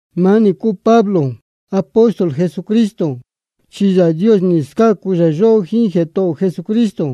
Maá nī cúu Pablo, apóstol Jesucristo, chi Yāā Dios jā scácu yóhó, jíín Jētohō ō Jesucristo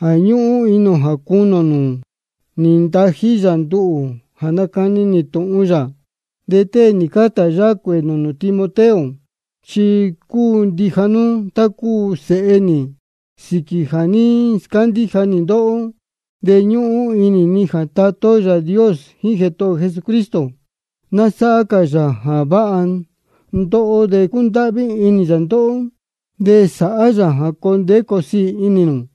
jā ñúhún inī ō jā cunī ō nūū, nī ntají yā nduhū jā nacani nī tūhun yā. De tée nī carta yáhá cuēē nūū nū Timoteo, chi cúu ndija nú tá cúu sēhe nī sīquī jā ní scándíja nī ndóhó. De ñúhún inī ni jā Tatá ó Yāā Dios jíín Jētohō ō Jesucristo ná sáhá cā yā jā váha ndóhó, de cundáhví inī yā ndóhó, de sāhá yā jā coo ndeé coo siī inī nū.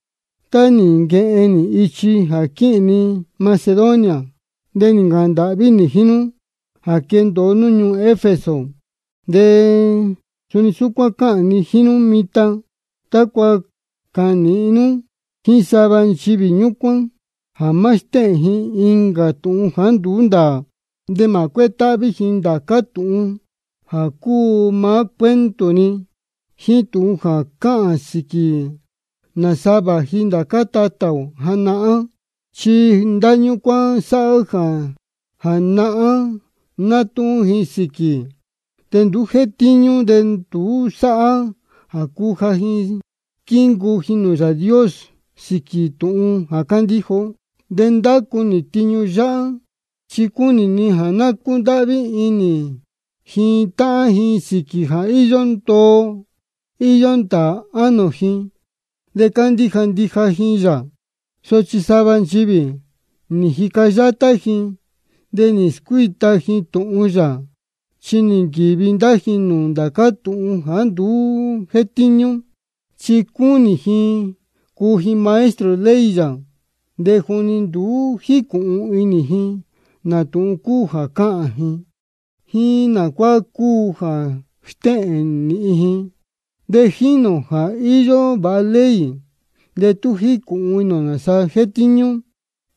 Tá nī nquehen nī ichi jā quíhīn ni Macedonia, de nī ncāhān ndāhví nī jíín nú jā quendōo nú ñuū Efeso. De suni súcuán cáhān ni jíín nú mitan, tácua cāhān nīhin nú jíín sava nchivī ñúcuán jā má stéhēn ji incā tūhun jāá nduú ndāā. De mā cuétáhví ji ndācá tūhun jā cúu maá cuento-ni, jíín tūhun jā cáhān sīquī nāsa vāji ndācá tatā ō janahán. Chi ndá ñúcuán sáhá jā nahán nátúhún ji sīquī, de nduú jétíñú, de nduú sáhá jā cuja ji squíncuu ji nūū Yāā Dios sīquī tūhun jā cándíja ó. De ndácu nī tiñu yáhá chi cúnī ni jā ná cúndáhví inī ji táhán ji sīquī jā íyó ndoo íyó ndāā ánō ji de cándíja ndija ji yā. Sochi sava nchivī chi nī jica yátá ji, de nī scuíta ji tūhun yā, chi nī nquīvi ndá ji nūū ndācá tūhun jāá nduú jétíñú. Chi cúnī ji cuu ji maestro ley yā, de juni nduú jícūhun inī ji nā tūhun cúu jā cáhān ji, jíín nā cuá cúu jā stéhēn nīhin ji. De jínī ō jā íyó vāha ley, de tú jícūhun inī ō nāsa jétíñú.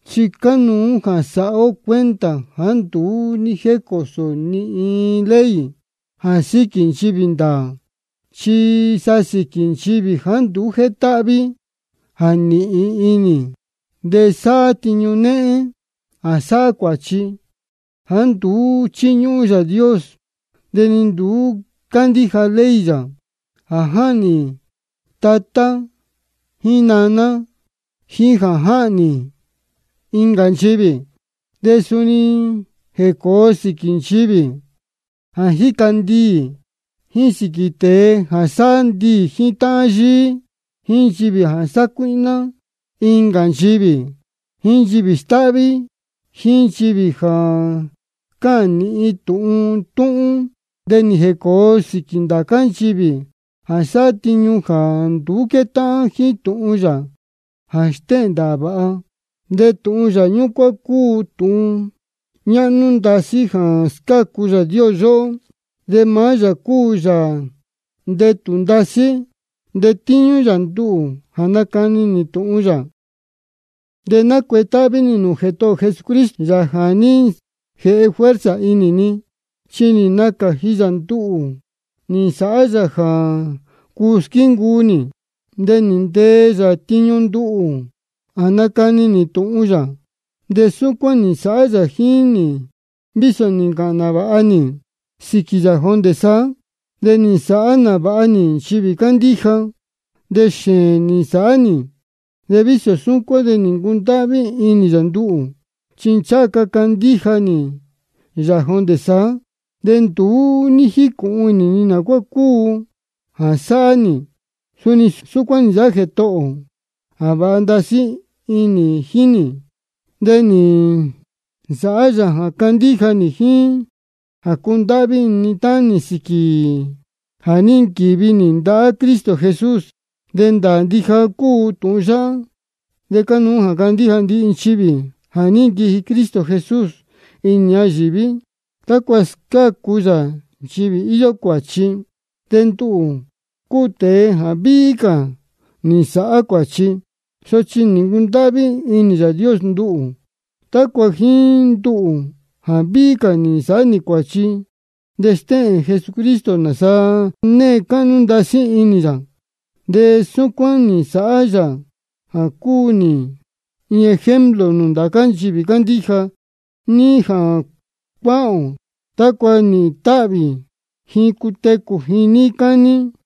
Chi cánuú jā sāhá ó cuenta jāá nduú ní jécōo ni iin ley jā síquī nchivī ndāā, chi sa sīquī nchivī jāá nduú jétáhví, jā nīhin inī, jā sáhá tiñu néhén, jā sáhá cuāchi, jāá nduú chíñúhún Yāā Dios de ni nduú cándíja ley yā, jā jáhnī tatá jíín naná, jíín jā jáhnī ndīyi. De suni nī jēcōo sīquī nchivī jā jíca ndiī, jíín sīquī tēe jā sáhá ndiī jíín táhán yíí, jíín nchivī jā sácuíhná incā nchivī, jíín nchivī stáhví, jíín nchivī jā cáhān nīhin tūhun túhún. De nī jēcōo sīquī ndācá cā nchivī jā sáhá tiñu jāá nduú quétáhán jíín tūhun yā jā stéhēn ndāā vāha. De tūhun yā ñúcuán cúu tūhun ñáhnú ndasí jā scácu Yāā Dios yóhó, de maá yā cúu Yāā ndetū ndasí. De nī ntetíñú yā nduhū jā nácani nī tūhun yā. De nácuetáhví nī nūū Jētohō ō Jesucristo, Yāā jā ní jēhe fuerza inī ni, chi nī nacāji yā nduhū nī nsāhá yā jā cuu squíncuu nī, de nī ntee yā tiñu nduhū jā nácani nī tūhun yā. De súcuán nī nsāhá yā jíín nī vísō nī ncāhān nāvāha nī sīquī yā jondē saá, de nī nsāhá nāvāha nī nchivī cándíja, de xēēn nī nsāhá nī. De vísō súcuán de nī ncundáhví inī yā nduhū, chi ncháha ca candíja nī yā jondē saá, de nduú ní jícūhun inī ni nā cuá cúu jā sáhá nī. Súcuán nī nsāhá Jētohō ō jā váha ndasí jíín nī. De nī nsāhá yā jā candíja nī jíín jā cundáhví inī ni táhán nī sīquī jā ní nquīvi nī ndahá Cristo Jesús. De ndāā ndija cúu tūhun yáhá, de cánuú jā candíja ndihi nchivī: Jā ní nquiji Cristo Jesús inī ñayīví tácua scácu yā nchivī íyó cuāchi. De nduhū cúu tēe jā víhí cā nī nsāhá cuāchi. Sochi nī ncundáhví inī Yāā Dios nduhū, tácua jíín nduhū jā víhí cā nī nsāhá cuāchi de stéhēn Jesucristo nāsa née cáhnú ndasí inī yā. De súcuán nī nsāhá yā jā cúu nī iin ejemplo nūū ndācá nchivī cándíja níí jā cuáhān ō, tácua nīhīn táhvī ji cutecū ji níí cání.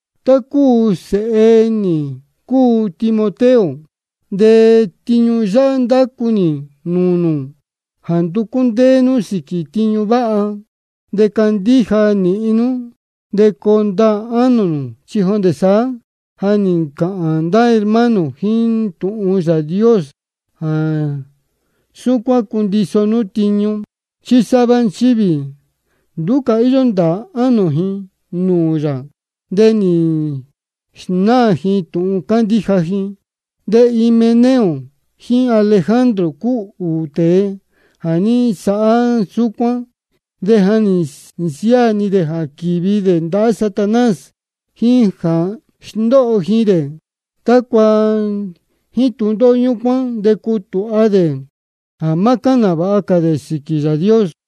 Tá cúu sēhe nī cúu nú Timoteo, de tiñu yáhá ndácu nī nūū nū, jā nducú ndéé nú sīquī tiñu váha. De candíja nīhin nú, de coo ndaā ánō nū. Chi jondē saá ja nī ncāhān ndá hermano jíín tūhun Yāā Dios jā súcuán cundiso nú tiñu. Chi sava nchivī nduú cā íyó ndāā ánō ji nūū yā, de nī snáā ji tūhun cándíja ji. De Himeneo jíín Alejandro cúu ūū tēe jā ní nsāhá súcuán. De ja nī nsiáā ni dē jā quīvi dē ndahá Satanás, jā sndóho ji dē, tácua jíín tūndóhó ñúcuán de cutūha dē jā má cáhān nāvāha cā dē sīquī Yāā Dios.